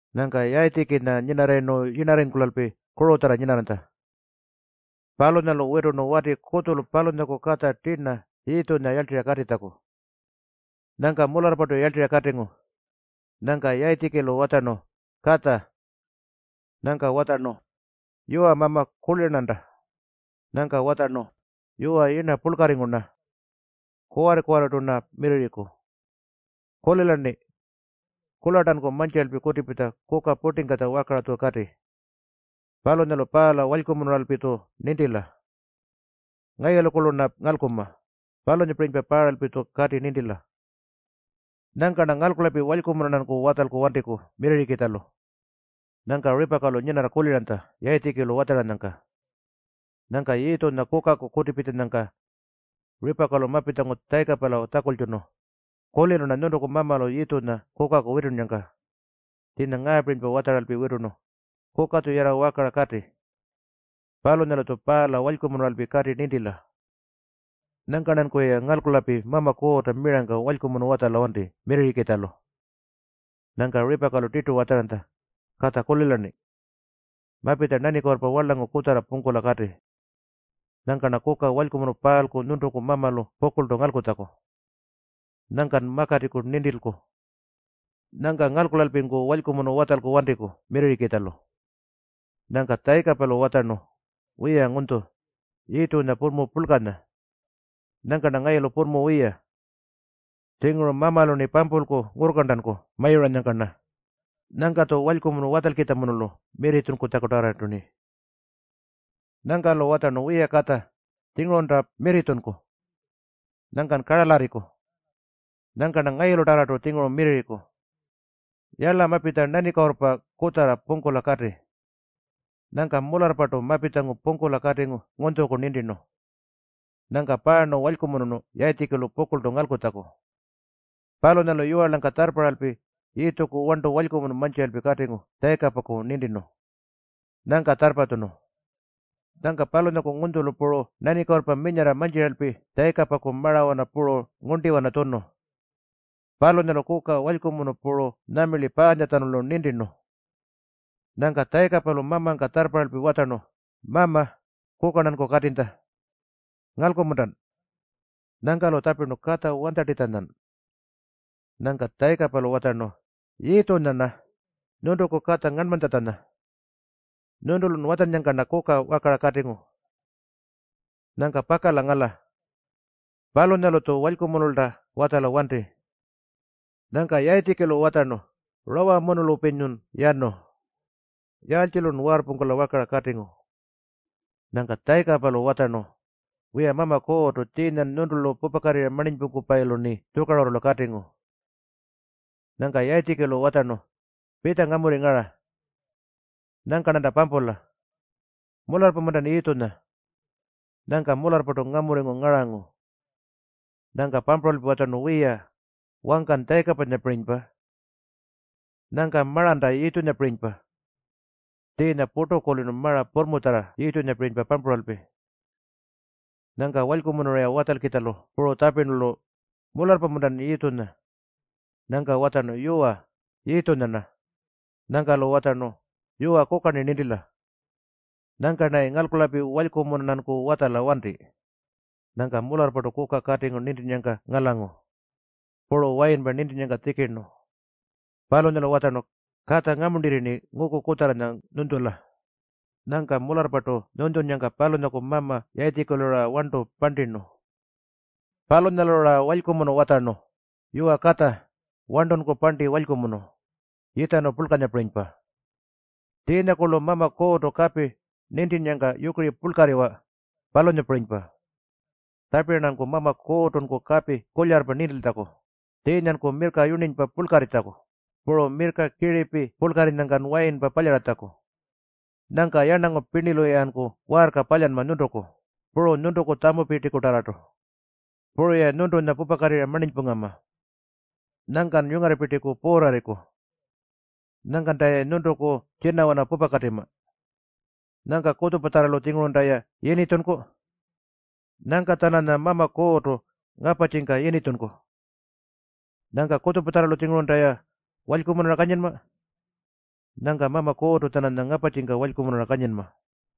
Nyangka Yayitjikinya nyinarrayirnu yirnarringkulalpi kurutjarra nyinarranytja. Palunyalu witurnu wati kutjulu palunyaku katja tirna Yiitjunya yarltirra katitjaku. Nyangka mularrpartu yarltirra katingu. Nyangka Yayitjikilu watjarnu, “Katja!” Nyangka watjarnu, “Yuwa Mama, kulira-rnanta.” Nyangka watjarnu, “Yuwa, yirna purlkarringu-rna. Kuwarri-kuwarrirtu-rna wiyarriku. Kulila-rni. Kurlartanku mantjira kutipitja kuka purtingkatja wakara-tju kati. Palunyalu paala walykumunuralpi-tju nintila. Ngayulukurlu-rna ngalkunma, palunyapirinypa paaralpi-tju kati nintila. Nyangka-rna ngalkulalpi walykumunu-rnanku watjalku wantiku wiyarrikitjalu.” Nyangka Ripakalu nyinarra kuliranytja Yayitjikilu watjaranyangka. Nyangka Yiitjunya kukaku kutipitjanyangka Ripakalu mapitjangu Tjayikapala tjakultjunu, “Kulirnu-rna nyuntuku mamalu Yiitjunya kukaku witunnyangka. Tjiinya ngaapirinypa watjaralpi witurnu, ‘Kuka-tju yarra wakara kati. Palunyalu-tju paala walykumunuralpi kati nintila. Nyangka-rnankuyi ngalkulalpi Mama Kuurrta mirangka walykumunu watjala wanti wiyarrikitjalu.’” Nyangka Ripakalu tirtu watjaranytja, “Katja, kulila-rni. Mapitja nanikuurrpa warlangu kutjarra pungkula kati. Nyangka-rna kuka walykumunu paalku nyuntuku mamalu pukurltu ngalkutjaku. Nyangkan makatiku nintilku. Nyangka ngalkulalpinku walykumunu watjalku wantiku wiyarrikitjalu.” Nyangka Tjayikapalu watjarnu, “Wiya Ngunytju, Yiitjunya purrmu purlkanya. Nyangka-rna ngayulu purrmu wiya. Tjinguru Mamalu-rni pampulku ngurrkarntanku mayuranyangka-rna. Nyangka-tju walykumunu watjalkitjamunulu mirritjunkutarrartu-rni.” Nyangka-lu watjarnu, “Wiya Katja, tjingurunta mirritjunku, nyangkan karalyarriku. Nyangka-rna ngayulutarrartu tjinguru mirrirriku. Yala, mapitja nanikuurrpa kutjarra pungkula kati.” Nyangka mularrpartu mapitjangu pungkula katingu ngunytjuku nintirnu. Nyangka paarnu walykumunurnu Yayitjikilu pukurltu ngalkutjaku. Palunyalu yiwarlangka tjarrparralpi Yiitjuku warntu walykumunu mantjira katingu Tjayikapaku nintirnu. Nyangka tjarrpatjunu. Nyangka palunyaku ngunytjulu puru nanikuurrpa minyarra mantjiralpi Tjayikapaku marawana puru ngurntiwana tjunu. Palunyalu kuka walykumunu puru nyuma paantjatjanulu nintirnu. Nyangka Tjayikapalu mamangka tjarrparralpi watjarnu, “Mama, kuka-rnanku katinytja. Ngalku-muntan?” Nyangka-lu tjapirnu, “Katja wanytjartitjanyan?” Nyangka Tjayikapalu watjarnu, “Yiitjunya-rna nyuntuku katja ngarnmanytjatjanya. Nyuntulun watjannyangka-rna kuka wakara katingu. Nyangka pakala ngala. Palunyalu-tju walykumunulta watjala wanti.” Nyangka Yayitjikilu watjarnu, “Rawamunulpinyun yanu? Yaaltjilun waarrpungkula wakara katingu?” Nyangka Tjayikapalu watjarnu, “Wiya, Mama Kuurrtu, tjiinyan nyuntulu pupakatirra marninypungkupayilu-rni tjukarurrulu katingu.” Nyangka Yayitjikilu watjarnu, “Pitja ngamurri ngara. Nyangka-rnanta pampula. Mularrpa-muntan Yiitjunya?” Nyangka mularrpartu ngamurringu ngarangu. Nyangka pampuralpi watjarnu, “Wiya, wangkan Tjayikapanyapirinypa. Nyangka maranta Yiitjunyapirinypa.” Tjiinya purtu kulirnu mara purrmutjarra Yiitjunyapirinypa pampuralpi. Nyangka walykumunu-ra watjalkitjalu puru tjapirnu-lu, “Mularrpa-muntan Yiitjunya?” Nyangka watjarnu, “Yuwa, Yiitjunya-rna.” Nyangka-lu watjarnu, “Yuwa, kuka-rni nintila. Nyangka-rnayi ngalkulalpi walykumunu-rnanku watjala wanti.” Nyangka mularrpartu kuka katingu nintinnyangka ngalangu. Puru wayinpa nintinnyangka tjikirnu. Palunyalu watjarnu, “Katja, ngamuntirri-rni nguku kutjarranya nyunytjula.” Nyangka mularrpartu nyunytjunnyangka palunyaku mama Yayitjikilu-ra warntu parntirnu. Palunyalu-ra walykumunu watjarnu, “Yuwa Katja, warntunku parnti walykumunu, yitjarnu purlkanyapirinypa. Tjiinyakurlu Mama Kuurrtu kapi nintinnyangka yukiri purlkarriwa, palunyapirinypa. Tjapira-rnanku Mama Kuurrtunku kapi kulyarrpa nintiltjaku, tjiinyanku mirrka yurninypa purlkarritjaku, puru mirrka kiripi purlkarrinyangkan wayinpa palyaratjaku. Nyangka yarnangu pirnilu-yanku waarka palyanma nyuntuku, puru nyuntuku tjamupirtikutarrartu. Puru-ya nyuntunya pupakatirra marninypungama. Nyangkan yungarrapirtiku puurrarriku. Nyangkanta-ya nyuntuku tjinawana pupakatima. Nyangka kutjupatjarralu-tjingurunta-ya yinitjunku. Nyangka-tjananya Mama Kuurrtu ngaparrtjika yinitjunku. Nyangka kutjupatjarralu-tjingurunta-ya walykumunura kanyinma. Nyangka Mama Kuurrtu-tjananya ngaparrtjika walykumunura kanyinma.”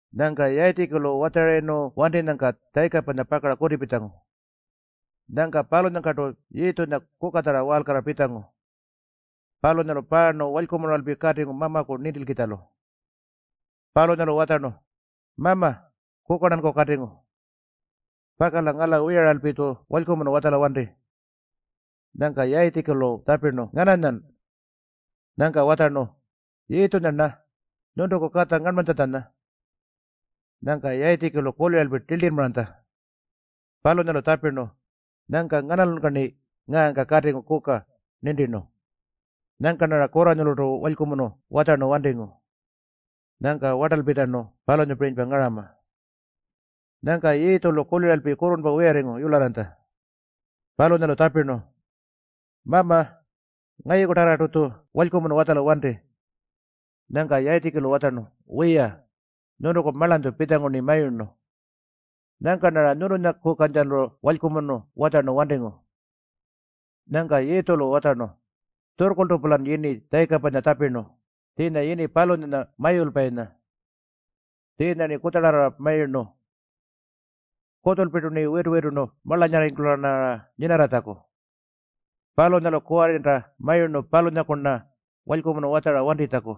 Nyangka Yayitjikilu watjarayirnu wantinyangka Tjayikapanya pakara kutipitjangu. Nyangka palunyangkartu Yiitjunya kukatjarra waalkarrara pitjangu. Palunyalu paarnu walykumunuralpi katingu mamaku nintilkitjalu. Palunyalu watjarnu, “Mama, kuka-rnanku katingu. Pakala ngala wiyaralpi-tju walykumunu watjala wanti.” Nyangka Yayitjikilu tjapirnu, “Ngananyan?” Nyangka watjarnu, “Yiitjunya-rna, nyuntuku katja ngarnmanytjatjanya.” Nyangka Yayitjikilu kuliralpi tiltirrmaranytja. Palunyalu tjapirnu, “Nyangka nganalunyka-rni ngaangka katingu kuka nintirnu? Nyangka-rnara kurranyulurtu walykumunu watjarnu wantingu. Nyangka wartalpitjanu palunyapirinypa ngarama.” Nyangka Yiitjulu kuliralpi kurrurnpa wiyarringu yularranytja. Palunyalu tjapirnu, “Mama, ngayukutarrartu-tju walykumunu watjala wanti.” Nyangka Yayitjikilu watjarnu, “Wiya, nyuntuku marlanytju pitjangu-rni mayurnu. Nyangka-rnara nyuntunyakukantjalu walykumunu watjarnu wantingu.” Nyangka Yiitjulu watjarnu, “Tjurrkurltu-pulan yini Tjayikapanya tjapirnu, tjiinya yini palunyanya Mayulpayinya. Tjiinya-rni kutjarrara mayurnu. Kutjulpirtu-rni witu-witurnu marlanyarringkula-rnara nyinarratjaku. Palunyalu kuwarrinta mayurnu palunyaku-ran walykumunu watjara wantitjaku.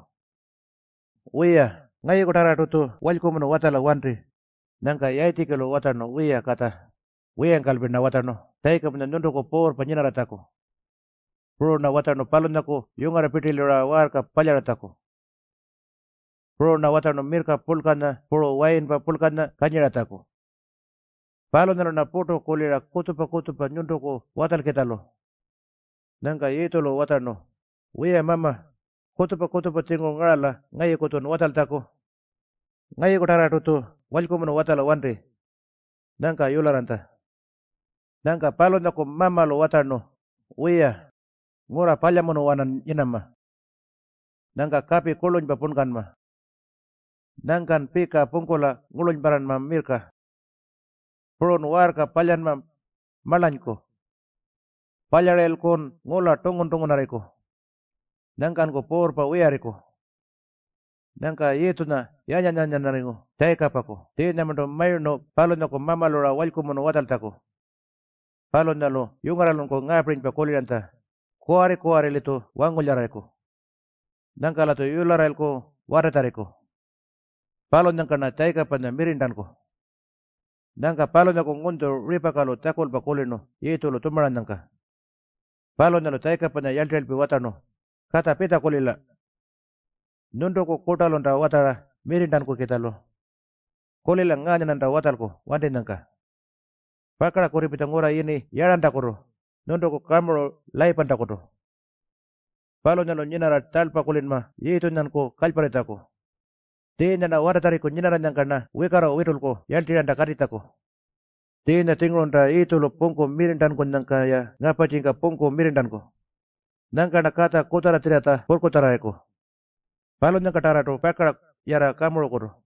Wiya, ngayukutarrartu-tju walykumunu watjala wanti.” Nyangka Yayitjikilu watjarnu, “Wiya Katja, wiyangkalpi-rna watjarnu Tjayikapanya nyuntuku puurrpa nyinarratjaku. Puru-rna watjarnu palunyaku yungarrapirtilu-ra waarka palyaratjaku. Puru-rna watjarnu mirrka purlkanya puru wayinpa purlkanya kanyiratjaku. Palunyalu-rna purtu kulira kutjupa-kutjupa nyuntuku watjalkitjalu.” Nyangka Yiitjulu watjarnu, “Wiya Mama, kutjupa-kutjupa-tjinguru ngarala ngayuku-tjun watjaltjaku. Ngayukutarrartu-tju walykumunu watjala wanti.” Nyangka yularranytja. Nyangka palunyaku mamalu watjarnu, “Wiya, ngurra palyamunuwanan nyinama. Nyangka kapi kurlunypa punkanma. Nyangkan pika pungkula mirrka ngurlunyparranma. Purun waarka palyanma marlanyku. Palyarayilkun ngula tungun-tungunarriku. Nyangkanku puurrpa wiyarriku.” Nyangka Yiitjunya yanyan-yanyanarringu Tjayikapaku, tjiinyamarntu mayurnu palunyaku mamalu-ra walykumunu watjaltjaku. Palunyalu yungarralunku ngaapirinypa kuliranytja, “Kuwarri-kuwarri-litju wangulyararriku. Nyangka-latju yularrayilku watatjarriku. Palunyangka-rna Tjayikapanya mirrirntanku.” Nyangka palunyaku ngunytju Ripakalu tjakulpa kulirnu Yiitjulu tjumaranyangka. Palunyalu Tjayikapanya yarltirralpi watjarnu, “Katja, pitja kulila. Nyuntuku kurtalunta watjara mirrirntankukitjalu. Kulila ngaanya-rnanta watjalku wantinyangka. Pakara kutipitja ngurra yini Yarrantakutu, nyuntuku kamuru Layipantakutu. Palunyalu nyinarra tjarlpa kulinma Yiitjunyanku kalyparritjaku. Tjiinya watatjarriku nyinarranyangka-rna wikarru witulku yarltirranta katitjaku. Tjiinya-tjingurunta Yiitjulu pungku mirrirntankunyangka-ya ngaparrtjika pungku mirrirntanku. Nyangka-rna katja kutjarratjirratja purrkutjarrarriku. Palunyangkatarrartu pakara yarra kamurukutu.”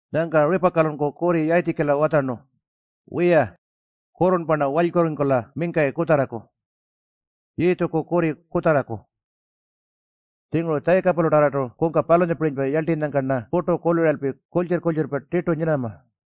Nyangka Ripakalunku kurri Yayitjikila watjarnu, “Wiya, kurrurnpa-rna walykurringkula mingkayi kutjarraku, Yiitjuku kurri kutjarraku. Tjinguru Tjayikapalutarrartu kungka palunyapirinypa yarltinyangka-rna purtu kuliralpi kurltjirr-kurltjirrpa tirtu nyinama.”